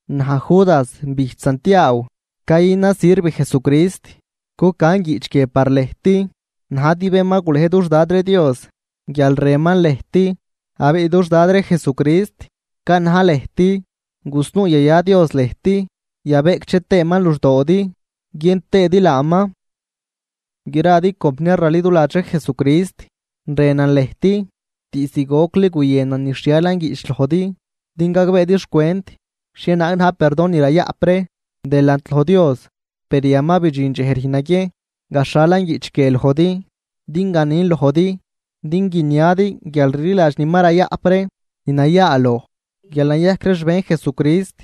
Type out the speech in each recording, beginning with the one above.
Naj, Judas bijch Santiaaw, cayünan sirv Jesucrist, cucan guiꞌch guie par lëjt najdi bén ma gulej dux Dad ree Dios guial rënman lëjt, abiꞌ dux Dad ree Jesucrist canaj lëjt. Gusnuu yaya Dios lëjt, yabeꞌcdxeman luxdoodi guiën tëëdi laaman. Gradi compniar raliduladx ree Jesucrist, rënan lëjt, diizd gocli guyënan nixhialan guiꞌch lojdi, din gagbeedi xcwent xhienaag na̱j perdon ni rayaꞌp ree delant loj Dios, per yan ma bidxin dxej rüjn naguiejn gaxhalan guiꞌch guie lojdi din ganin lojdi din guiniadi guialrliladx ni ma rayaꞌp ree, ni nayaaloj, guial nayajc ree xbejn Jesucrist.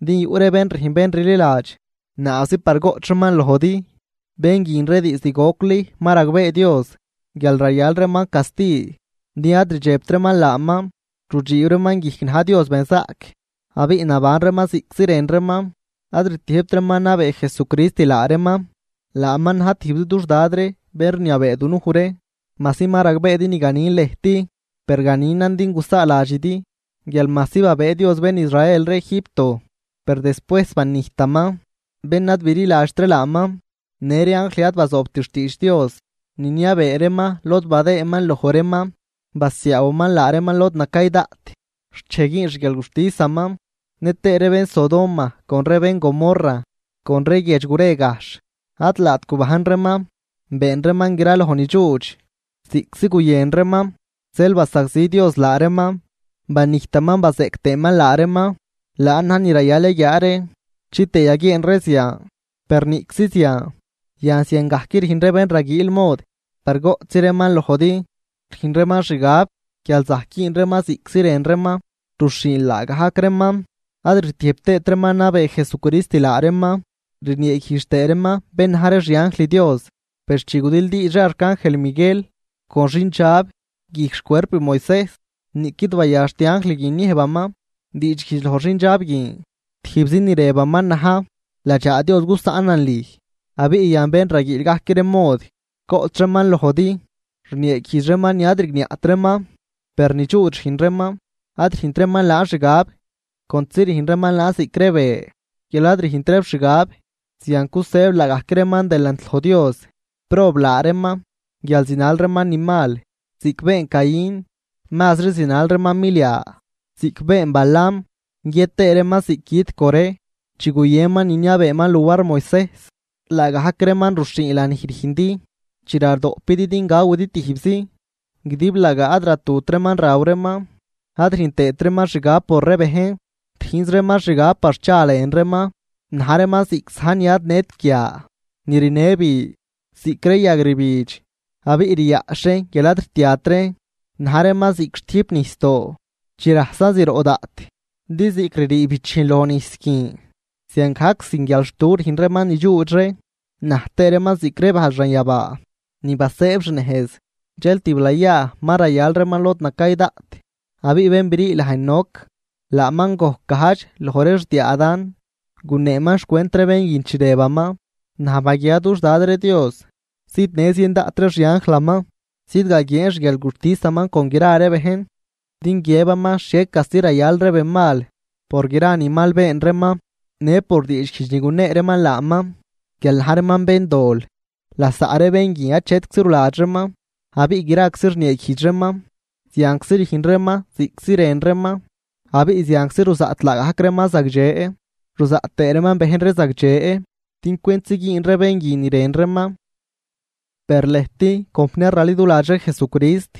Din yuꞌ ree bén rüjn bén rliladx naabzi par goꞌch reeman lojdi. Bén guin ree diizd gocli ma ragbee Dios guial rayal reeman casti, din ad rdxebt reeman laaman, rudxiib reeman guijc na̱j Dios benzaꞌc, abiꞌ naban reeman ziꞌctzi rën reeman. Ad rtiëjbt reeman nabee Jesucrist laa reeman, laaman na̱j tijbzi dux Dad ree bén rniabee dunuj ree. Majsi ma ragbeedi ni ganin lëjt, per ganinan din gusaaladxidi guial majsi babëë Dios bén Israel ree Egipto, per despuejs banijtaman bén ad bililadxt ree laaman. Në ree anjl ad bazoobt xtiidx Dios niniabee reeman lod badëëman loj reeman, basiaawaman laa reeman lod nacay daꞌt xt dxej güün xguialguxtisaman. Nëtëë ree bén Sodoma con ree bén Gomorra con ree guiedx gure gajxh, ad laat gubajn reeman, been reeman gra loj nidxuudx ziꞌctzi guyën reeman, zeel basagzi Dios laa reeman, banijtaman bazeꞌc tëëman laa reeman, laan na̱j ni rayal yaguiaa ree chitëë yaguieen ree zian. Per niꞌczi zian, yan ziangajc rüjn ree bén raguiil mod par goꞌchzi reeman lojdi, rüjn reeman xgab guial zajc güün reeman ziꞌctzi rën reeman, ruxhiin laagajc reeman, ad rtiëjb tëët reeman nabee Jesucrist laa reeman, rnieeguijdx tëë reeman bén na̱j ree xianjl Dios. Per chi gudildiidx ree arcangel Miguel con xindxab guijc xcuerp Moisejs, niꞌquid bayaxt anjl guin niëjbaman diidxguijdx loj xindxab guin, tijbzi ni rëbaman na̱j: “Ladxaa Dios gusaꞌnan lüj.” Abiꞌ yan bén raguiil gajc ree mod goꞌch reeman lojdi, rnieeguijdx reeman ni ad rigniaꞌt reeman, per nidxuudx rüjn reeman, ad rüjnt reeman laan xgab, contzi rüjn reeman laan ziꞌc ree be guial ad rüjnt reeb xgab. Zian cusëëb laagajc reeman delant loj Dios. ¡Prob laa reeman!, guial zinal reeman ni mal ziꞌc been Caín, mazri zinal reeman milia ziꞌc been Balaam, guiët tëë reeman ziꞌc güt Coré chi guyënman niniabeeman luar Moisejs. Laagajc reeman ruxhiin lanij rüjndi chi radoꞌpidi din gawidi tijbzi, guidiblagaa ad ratut reeman raw reeman ad rüjn tëët reeman xgab por ree bejn, rüjnz reeman xgab par cha lën reeman. Na̱j reeman ziꞌc za̱j ni ad nët guia ni rinë bi, ziꞌc ree yag rbidx abiꞌ riaꞌxh reen guial ad rtiat reen. Na̱j reeman ziꞌc xtüjp nijsdoo chi rajsan zroꞌ daꞌt, din ziꞌc ririi bichijn loj nijs guin, ziangajc sin guialxtu rüjn reeman nidxuudx ree, na̱j tëë reeman ziꞌc ree bajl xanyabaa ni basëëb xnejz, dxel tiblayaa ma rayal reeman lod nacay daꞌt. Abiꞌ bén brii laj Enoc, laaman gojc gajdx loj ree xdiaa Adán, guneeman xcwent ree bén guin chi rëbaman: “Naj baguiaa dux Dad Dios zidnë zien daꞌt ree xianjlaman zidgaguieen xguialguxtisaman con gra ree bejn, din guiëbaman xhie casti rayal ree benmal por gra ni mal been reeman në por diidxguijdx ni gunee reeman laaman guial na̱j reeman béndol.” Lasaꞌ ree bén guin achetczi ruladx reeman, abiꞌ graczi rnieeguijdx reeman. Zianczi rüjn reeman ziꞌctzi rën reeman, abiꞌ zianczi ruzaꞌt laagajc reeman zagdxe ruzaꞌt tëë reeman bejn ree zagdxe din cwentzi güün ree bén guin ni rën reeman. Per lëjt compniar raliduladx ree Jesucrist,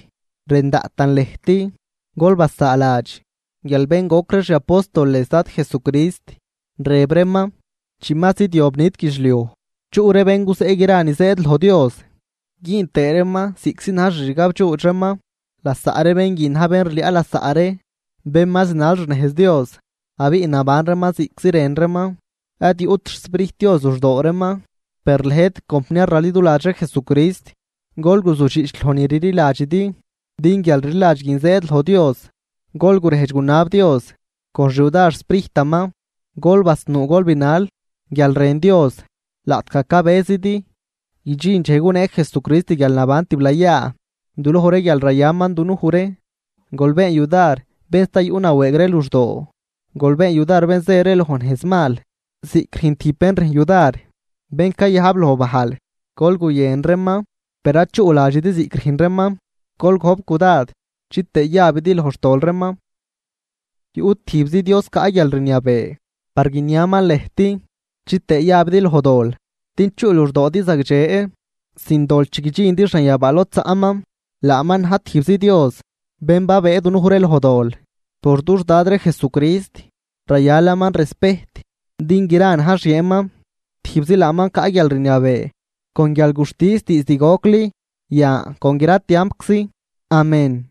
rën daꞌtan lëjt, gol basaaladx guial bén goc ree xi apóstoles Dad Jesucrist rëb reeman: “Chi ma zidyob nit guidxliuj, chuꞌ ree bén guzeꞌ gra ni zëëd loj Dios güün tëë reeman ziꞌctzi na̱j xixgabdxuudx reeman.” Lasaꞌ ree bén guin na̱j bén rliaꞌ lasaꞌ ree bén ma zinal xnejz Dios, abiꞌ naban reeman ziꞌctzi rën reeman, ad yuꞌt xSprijt Dios luxdoo reeman. Per lëjt compniar raliduladx ree Jesucrist, gol guzudxiꞌch loj ni rliladxidi, din guialrliladx guin zëëd loj Dios. Gol gurejdx gunab Dios con xyudar xSprijtaman. Gol basnuu gol binal guial rën Dios laꞌtgaj cabëzidi guidxin dxej gunee Jesucrist guialnaban tiblayaa duloj ree guial rayaman dunuj ree. Gol been yudar bén sta yuꞌ nawëëg ree luxdoo. Gol been yudar bén zë ree loj nejzmal, ziꞌc rüjn tijb bén rüjn yudar bén cayajb loj bajl, gol guyën reeman per ad chuꞌladxidi ziꞌc rüjn reeman, gol gojp cudad chitëë yabidi loj xtol reeman. Yuꞌ tijbzi Dios caꞌ guialrniabee par guiniaman lëjt, chitëë yabidi loj dol, din chuꞌ luxdoodi zagdxe sin dol chi guidxindi xanyabaa lod zaꞌman. Laaman na̱j tijbzi Dios bén babëë dunuj ree loj dol por dux Dad ree Jesucrist, rayalaman respejt din gra na̱j xieenman, tijbzi laaman caꞌ guialrniabee con guialguxtis diizd gocli, yan con gra tiampczi. Amén.